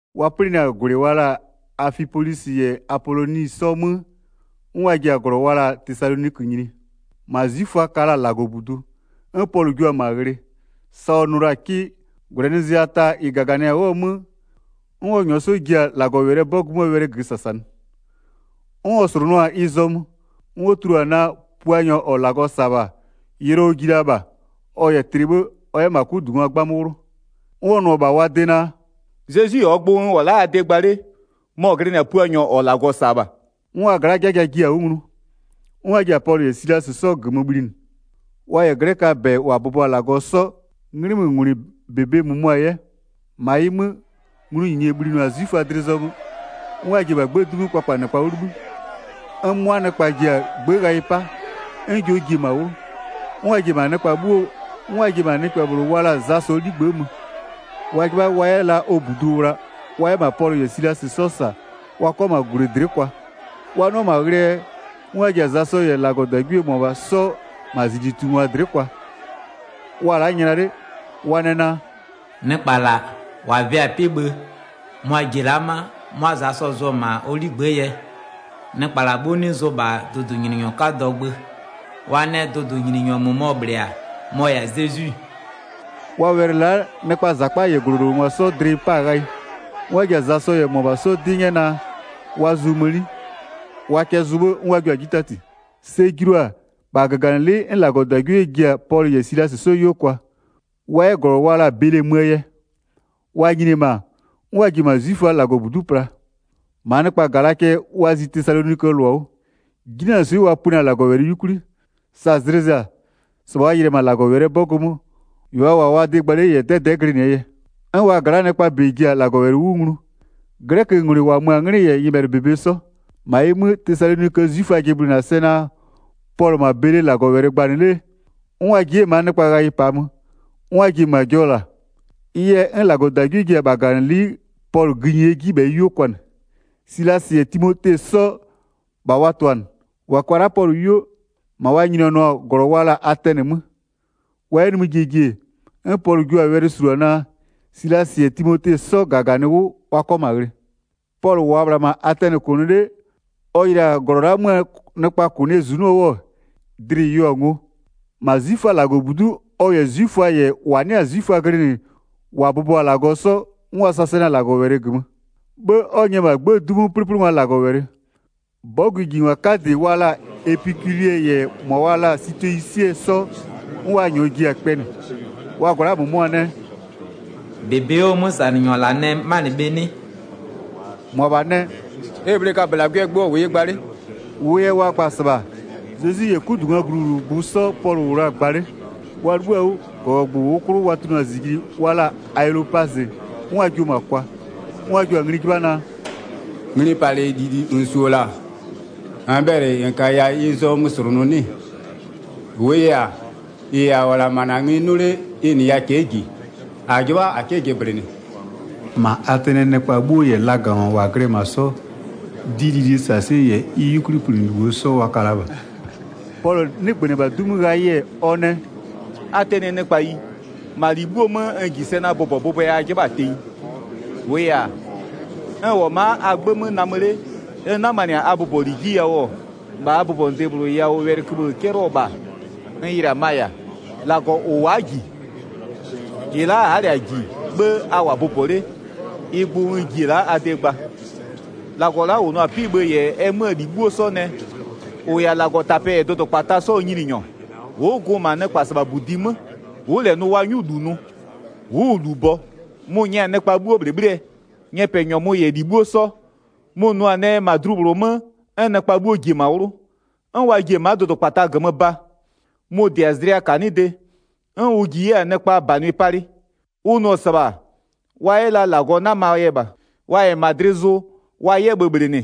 Wa 'plɩnɩ-a -gwlɩ wa la-a Afipolisɩ -yɛ Apoloni 'sɔ 'mö, 'n wa ji-a -glɔ wa la-a Tesalonikö nyini. -Ma 'zwiföa ka la-a -Lagɔbudu. 'N Pɔlʋ jua-a -ma ghlɩ, sa ɔ nʋ la-a 'kɩ. -Gwlɛnɩzlɩa ta -ɩ -gaganɩ-a 'wʋɔ 'mö, 'n ɔ -nyʋa 'sɔ ji-a -Lagɔwɛlɩɛ 'bɔgʋ 'möö wɛlɩ -gömö -sasanɩ. 'N ɔ slʋnʋa-a ɩ zɔmö, 'n ɔ tulua-a naa, Puanyɔ -ɔ -Lagɔ -sa-a -bha, yʋlɔ ɔ ji la -bha, ɔ -yɛ tlɩ 'bhë ɔ 'yɛ -ma 'kudungwa 'gbamö 'wlʋ. 'N ɔ nʋ-ɔ -bha wa de naa: “Zezwi -ɔɔ gbʋ n -wʋ-ɔ la'a a de gba 'le, mɔ-ɔ glɩnɩ-a 'mɔ Puanyɔ -ɔ -Lagɔ -sa-a -bha.” 'N wa gla'aa 'jaja jiɩ-a 'wʋ nglu. 'N wa ji-a Pɔlʋ -yɛ Silasɩ 'sɔ -gömö bhlinɩ, wa -yɛ 'glɛköaa -bɛ -wa bʋbɔ-a -Lagɔ 'sɔ, 'nglɩmöngwlɩɛ -bebe -mʋmʋa 'yɛ. 5-Ma ɩ 'mö, nglʋnyinye bhlinɩ-a 'zwiföa dlɩ zɔmö, 'n wa ji-e -bha 'gbëë 'du 'mö kpakpanɩkpa 'wʋ 'libhï, 'n 'mʋa nɩkpa ji-a 'gbë ghayɩ 'pa, 'n jɔ ji-e -ma 'wlʋ. 'N wa ji-e -ma nɩkpɛ -bhlʋ wa la-a Zasɔɔ 'ligbë'ë mö, wa 'jɩbha wa 'yɛ la ɔ -budu wla wa 'yɛ -ma Pɔlʋ -yɛ Silasɩ 'sɔ -sa wa 'kʋa -ma -gwlɩ dlɩ'ɩ kwa. Wa 'nʋa-a -ma ghlɩɛ yɛ, 'n wa ji-a Zasɔ -yɛ -Lagɔdagwie -mʋmʋa 'sɔ -ma -zijlitungwa dlɩ'ɩ kwa, wa-a la'a nyla 'le, wa nɛ naa: “Nɩkpa -la -wa vɩ-a 'pɩ-ɩ bhë mʋa-a ji-e la'a ma'a 'mʋa Zasɔ zʋ-ɔ -ma ɔ 'ligbë'ë yɛ. Nɩkpa -la 'bhuo 'nɩ zʋ -bha dʋdʋnyininyɔ 'kadɔɔ gbö. Wa nɛ dʋdʋnyininyɔ -mʋmɔ -bhlɩ-a, mɔ-ɔ -yɛ-a Zezwi.” Wa wɛlɩ la'a nɩkpaa -zakpa -yɛ -glɔlowlengwa 'sɔɔ dlɩ ɩ 'pa-a ghayɩ. 'N wa ji-a Zasɔ -yɛ -mʋabha 'sɔ 'dɩ 'nyɛ naa, wa zʋ mëni. Wa kɛ zʋ 'bhë 'n wa jua-a 'ji 'tati. Sɛ julu-a, -bha -gaganɩlɩ'ɩ 'n -Lagɔdagwie ji-a Pɔlʋ -yɛ Silasɩ 'sɔ 'yuo kwa, wa 'yɛ -glɔ wa la-a Bele möö yɛ. Wa nyini-e -ma, 'n wa ji-e -ma 'zwiföaa -Lagɔbudu'u pla. 11-Maa nɩkpa -ga la cɛ wa zi Tesaloniköö -lʋa 'wʋ. 'Jinanɩswɩ'ɩ wa pönɩ-a -Lagɔwɛlɩ 'yukwli. Sa zlɩ zɩ-a, -sɩbha wa yɩlɩ-ɛ -ma -Lagɔwɛlɩɛ 'bɔgʋ 'mö, -ɩ wa -wʋ-a wa de gba 'le -yɛ 'dɛdɛ'ɛ glɩnɩɛ yɛ. 'N wa gla'aa nɩkpaa -bɛ ji-a -Lagɔwɛlɩ 'wʋ nglu, 'glɛköngwlɩ -wa mö-a 'nglɩ -yɛ nyɩbhɛlɩɛ -bebe 'sɔ. 13-Ma ɩ 'mö, Tesaloniköö 'zwiföa jɩblɩnɩ-a sɛ naa, Pɔlʋ-ɔ -ma Bele -Lagɔwɛlɩ gbanɩ 'le-e, 'n wa ji 'yɛ-ɛ -maa nɩkpa ghayɩ -paa mö, 'n wa ji-e -ma jɔ -la. Ɩ yɛ, 'n -Lagɔdagwie ji-e -bha -gaganɩlɩ'ɩ Pɔlʋ gïnyie 'jibhɛyɩ 'yuo kwanɩ. Silasɩ -yɛ Timote 'sɔ, -bha wa tʋ-a -nɩ. 15-Wa kwa la-a Pɔlʋ 'yuo, -ma wa nyinianɩɔ-a -glɔ wa la-a Atɛnɩ 'mö. Wa 'yɛ nimï jie ji, 'n Pɔlʋ jua-a wɛlɩ -sulua naa, Silasɩ -yɛ Timote 'sɔ -gaganɩ 'wʋ wa 'kɔ -ma ghlɩ. Pɔlʋ -wʋʋa -bhla -ma Atɛnɩ -kʋnʋ 'le, ɔ yɩlɩ-a -glɔ la'aa 'möö nɩkpaa -kʋnɩɛ -zunɔ 'wʋ, dlɩ-ɩ yeo-a ngo. 17-Ma 'zwiföaa -Lagɔbudu'u ɔ -yɛ 'zwiföa -yɛ -wa 'nɩ-a 'zwiföa glɩnɩ -wa bʋbɔ-a -Lagɔ 'sɔ, 'n wa -sasanɩ-a -Lagɔwɛlɩ -gömö. 'Bhë 'n ɔ nyɛ-ɛ -bha 'gbëë 'du 'mö 'plɩplɩngwa -Lagɔwɛlɩ. 'Bɔgʋjingwa 'kadɩ wa la-a epikuliɛ -yɛ -mʋa wa la-a sitoyisiɛ 'sɔ, 'n wa -nyɔɔ ji-a kpɛnɩ. Wa gla'aa -mʋmʋa nɛ: “-Bebe 'wʋɔ 'mösanɩnyɔ -la nɛ 'manɩ bhe 'nɩ?” -Mʋabha nɛ: “E -bhlee kabölagwɩɛ gbʋ ɔ -wʋ yɩ gba 'le.” -Wʋʋ yɛ wa gba-a -sɩbha, Zezwi -yɛ 'kudungwaa gluwlʋgbʋ 'sɔ Pɔlʋ -wʋ la-a gba 'le. Wa 'libhïɔ-a 'wʋ, -gɔgɔgbʋ -ʋʋ 'klʋ wa tunʋ-a -zijli wa la-a Aelopazɩ, 'n wa jio-o -ma kwa. 'N wa jio-a ngli 'jɩbha naa: “Nglipalɩ -lili -n -su-o -la, -n bhɛlɩ -n -kaya ɩ zɔmö -slʋnʋ 'nɩ-ɩ? 20-Wʋʋ yɛ-a, -ɩ -a -wʋ-ɔ -la -ma -na ngli 'nʋnʋ 'le, ɩ -nɩya cɛ'ɛ -ji, -a 'jɩbha -a 'kɩ jɩblɩnɩ.” 21-Ma Atɛnɩɛ nɩkpa 'bhuo -yɛ lagangwa -wa glɩ-ɛ -ma 'sɔ, dɩlilie -sasɩɛ -yɛ ɩ 'yukwlipönɩlibho 'sɔ wa ka la -bha. Pɔlʋ 'nɩgbönɩ-ɛ -bha 'du 'mö ghayɩ-ɛ, ɔ nɛ: “Atɛnɩɛ nɩkpayi, -ma -li 'bhuo 'mö, n -ji sɛ naa bʋbɔbʋbʋɛ a 'jɩbha-a tenyi. 23-Wʋʋ yɛ-a, n -wʋ-ɔ ma'a a 'gbë 'mö namö 'le, n 'namanɩ-a a bʋbɔli 'ji yawʋ-ɔ, -bha a bʋbɔnʋde -bhlʋ yawʋ wɛlɩköbhë 'cɛlɩɔ-ɔ -bha n yɩlɩ-a ma-a -yɛ-a: -Lagɔ -ʋ wa'a -ji. -Ɩ la'a a'a -lɛ-a -ji 'bhë a -wʋ-a bʋbɔ 'le, ɩ gbʋ n ji-e la'a a de gba. 24-Lagɔ la'a -ʋ nʋ-a 'pɩ-ɩ bhë -yɛ ɛ 'möö -li 'bhuo 'sɔ nɛ, -ʋ -yɛ-a -Lagɔtapɛ -yɛ dʋdʋkpata 'sɔɔ Nyininyɔ, ʋ'ʋ gʋ-ʋ -ma nɩkpasɩbhabudi 'mö. Ʋ'ʋ -lɛ nʋ wa 'nyʋ -lu nʋ, ʋ'ʋ-ʋ -lu bɔ. Mʋ-ʋ nyɛ-a nɩkpa 'bhuo -bhlɩbhlɩɛ, nyɛpɛnyɔmʋ -yɛ -li 'bhuo 'sɔ. Mʋ-ʋ nʋ-a nɛ -ma dlu -bhlʋ 'mö, 'n nɩkpa 'bhuo ji-e -ma 'wlʋ, 'n wa ji-e ma'a dʋdʋkpata -gömö ba. Mʋ-ʋ -dɩ-a zlɩa -kanɩde, 'n ʋ ji 'yɛ-a nɩkpaa -banwɩ palɩ. Ʋ nʋ-ɔ -sɩbha wa 'yɛ la -Lagɔ 'namaa yɛ -bha, wa -yɛ -ma dlɩ zʋ wa 'yɛ bhöbhlɩnɩ,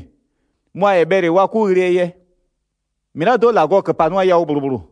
mʋa-a -yɛ bhɛlɩ wa 'kʋ ghlɩɛ yɛ. -Mɩlado'o -Lagɔ -köpanɩya yawʋ -bhlʋ -bhlʋ.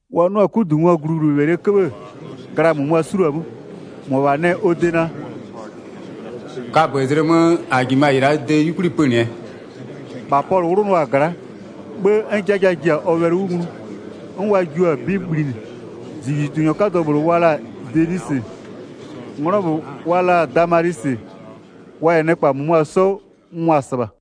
Wa 'nʋ-a 'kudungwaa gluwlʋwɛlɩɛ 'köbhë-ë, gla -mʋmʋa 'suluo-a 'mö, -mʋabha nɛ -bha ɔ de naa: “Kabözlɩ mö -a -jimö-a -ɩ -laa de 'yukwli pönɩɛ.” 33-Bha Pɔlʋ 'wlʋnʋa-a gla'a. 'Bhë, 'n 'jaja ji-a ɔ wɛlɩ 'wʋ nglu, 'n wa jio-a 'bɩ bhlinɩ, -zijlitunyɔ 'kadɔ -bhlʋ wa la-a Denisɩ, 'nglɔ -bhlʋ wa la-a Damalisɩ, wa -yɛ nɩkpa -mʋmʋa 'sɔ mʋa-a -sɩbha.